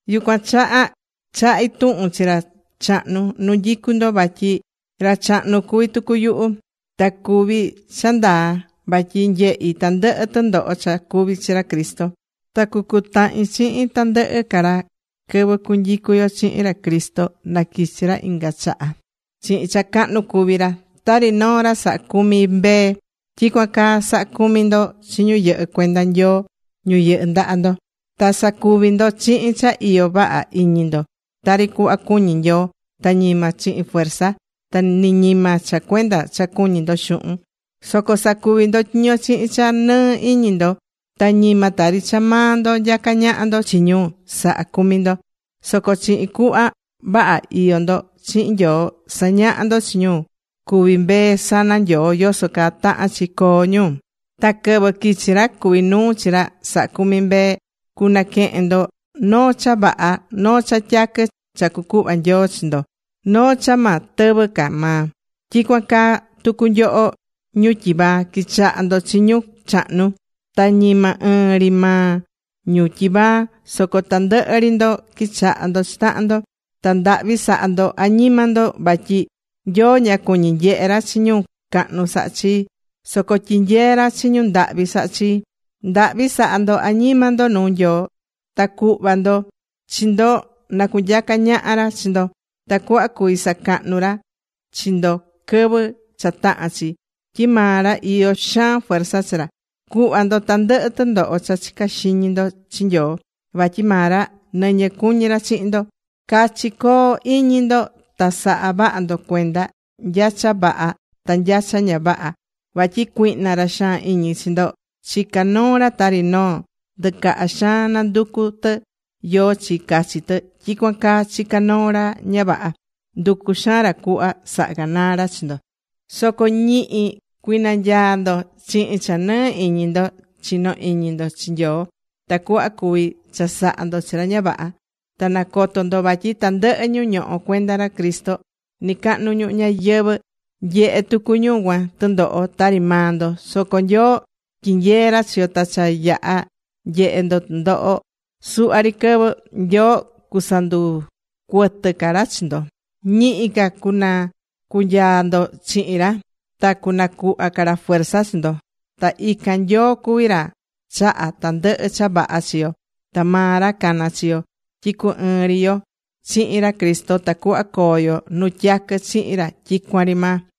Yucuan chaha chahí tuhun chi ra chahnu nu nyicú ndo. Vatyi ra chahnu cuví tucu yuhu. Ta cuví cha ndaa vatyi nyehi̱ tandɨhɨ tɨndoho cha cuvi̱ chi ra Cristo. Ta cucutahin chihin tandɨhɨ ca ra quɨvɨ cunyicu yo chihin ra Cristo na quichi ra inga chaha chihin cha cahnu cuví ra. Tari noo ra sahá cumi mbee, tyicuan caa sa̱ha cumi ndo chi ñu yɨhɨ́ cuenda Nyoo ñu yɨhɨ́ ndaha ndo. Ta sa̱cuvi ndo chihin cha iyo vaha iñi ndo tari cuhva cuñí Nyoo, ta ñima chihin fuerza. Ta ni ñima cha cuenda cha cuñí ndo xuhun. Soco sa̱cuvi ndo tyiño chihin cha nɨɨ iñi ndo. Ta ñima tari cha maa ndo nyacá ñaha ndo chi ñu sahá cumi ndo. Soco chihin cuhva vaha iyó ndo chihin Nyoo, sa̱ñaha ndo chi ñu cuví mbee sana Nyoo yoso caa tahán chi coo ñu. Ta quɨvɨ quichi ra cuví nuu chi ra sahá cumi mbee, cunaquehen ndo noo cha vaha, noo cha tyaquɨ cha cucuhva Nyoo chi ndo. Noo cha ma tɨvɨ ca maa. Tyicuan caa tucu nyoho ñu tyivaa, qui̱chaha ndo chi ñu chahnu. Ta ñima ɨɨn ri maa ñu tyivaa soco tandɨhɨ ri ndo qui̱chaha ndo chi tahan ndo. Ta ndahvi sa̱ha ndo añima ndo. Vatyi: Nyoo ña cuñí nyehe ra chi ñu cahnu sahá chi. Soco tyinyeé ra chi ñu ndahvi sahá chii. Ndahvi sa̱ha ndo añima ndo nuu Nyoo. Ta cu̱hva ndo chi ndo na cunyaca ñaha ra chi ndo tacuhva cuvi sacahnu ra chi ndo quɨvɨ cha tahán chi. Tyi maa ra iyó xaan fuerza chi ra. Cu̱hva ndo tandɨhɨ tɨndoho cha chicá xiñi ndo chi Nyoo. Vatyi maa ra nɨñɨ cuñi ra chihin ndo. Cachi co̱hon iñi ndo ta sa̱ha vaha ndo cuenda nya cha vaha ta nya cha ña vaha, vatyi cuihna, ra xaan iñi chi ndo, chicá noo ra tari noo ndɨcaha xaan nanducú tɨ yóó chi cachi tɨ, tyicuan caa chicá noo ra ña vaha, nducú xaan ra cuhva saha ganaa ra chi ndo. Soco ñihi cui̱nanyaa ndo chihin cha nɨɨ iñi ndo chinó iñi ndo chi Nyoo tacuhva cuvi chasaha ndo chi ra ña vaha. Ta na̱coto ndo vatyi tandɨhɨ ñu ñohó cuenda ra Cristo nɨcahnu ñuhu ñayɨvɨ̱, nyehé tucu ñu cuan tɨndoho tari maa ndo. Soco Nyoo tyinyeé ra chi yo, ta cha yaha̱ nyehe ndo tɨndoho suhva ri quɨvɨ, Nyoo cusanducuɨtɨ ca ra chi ndo, ñihi ca cunɨcunyaa ndo chihin ra ta cunacuhva ca ra fuerza chi ndo. Ta ican Nyoo cuví ra chahá tandɨhɨ cha vaha chi yo ta maa ra cana̱ chi yo tyi cu ɨɨn ri yo chihin ra Cristo tacuhva coo yo nu tyaquɨ chihin ra tyicuan ri maa.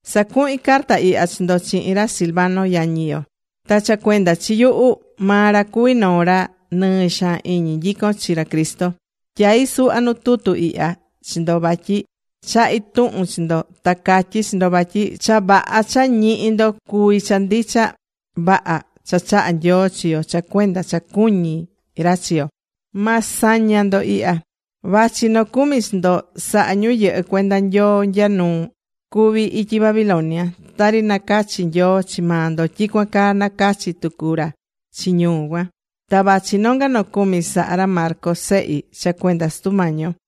Sacuhín carta ihya chi ndo chihin ra Silvano, yañi yo. Ta cha cuenda chi yuhu, maa ra cuví noo ra nɨɨ xaan iñi nyicón chi ra Cristo. Tyai̱ suhva nu tutu ihya chi ndo vatyi chahí tuhun chi ndo ta catyí chi ndo vatyi cha vaha cha ñihí ndo cuví cha ndicha vaha cha chahá Nyoo chi yo cha cuenda cha cuñí ra chi yo. Ma saña ndo ihya. Vachi nocumi chi ndo sahá ñu yɨhɨ́ cuenda Nyoo nya nu cuví ityi Babilonia. Tari nacachi̱ Nyoo chi maa ndo, tyicuan caa nacachi̱ tucu ra chi ñu cuan. Ta vachi nonga nocumi sahá ra Marcos sehi cha cuenda Sutu Mañi yo.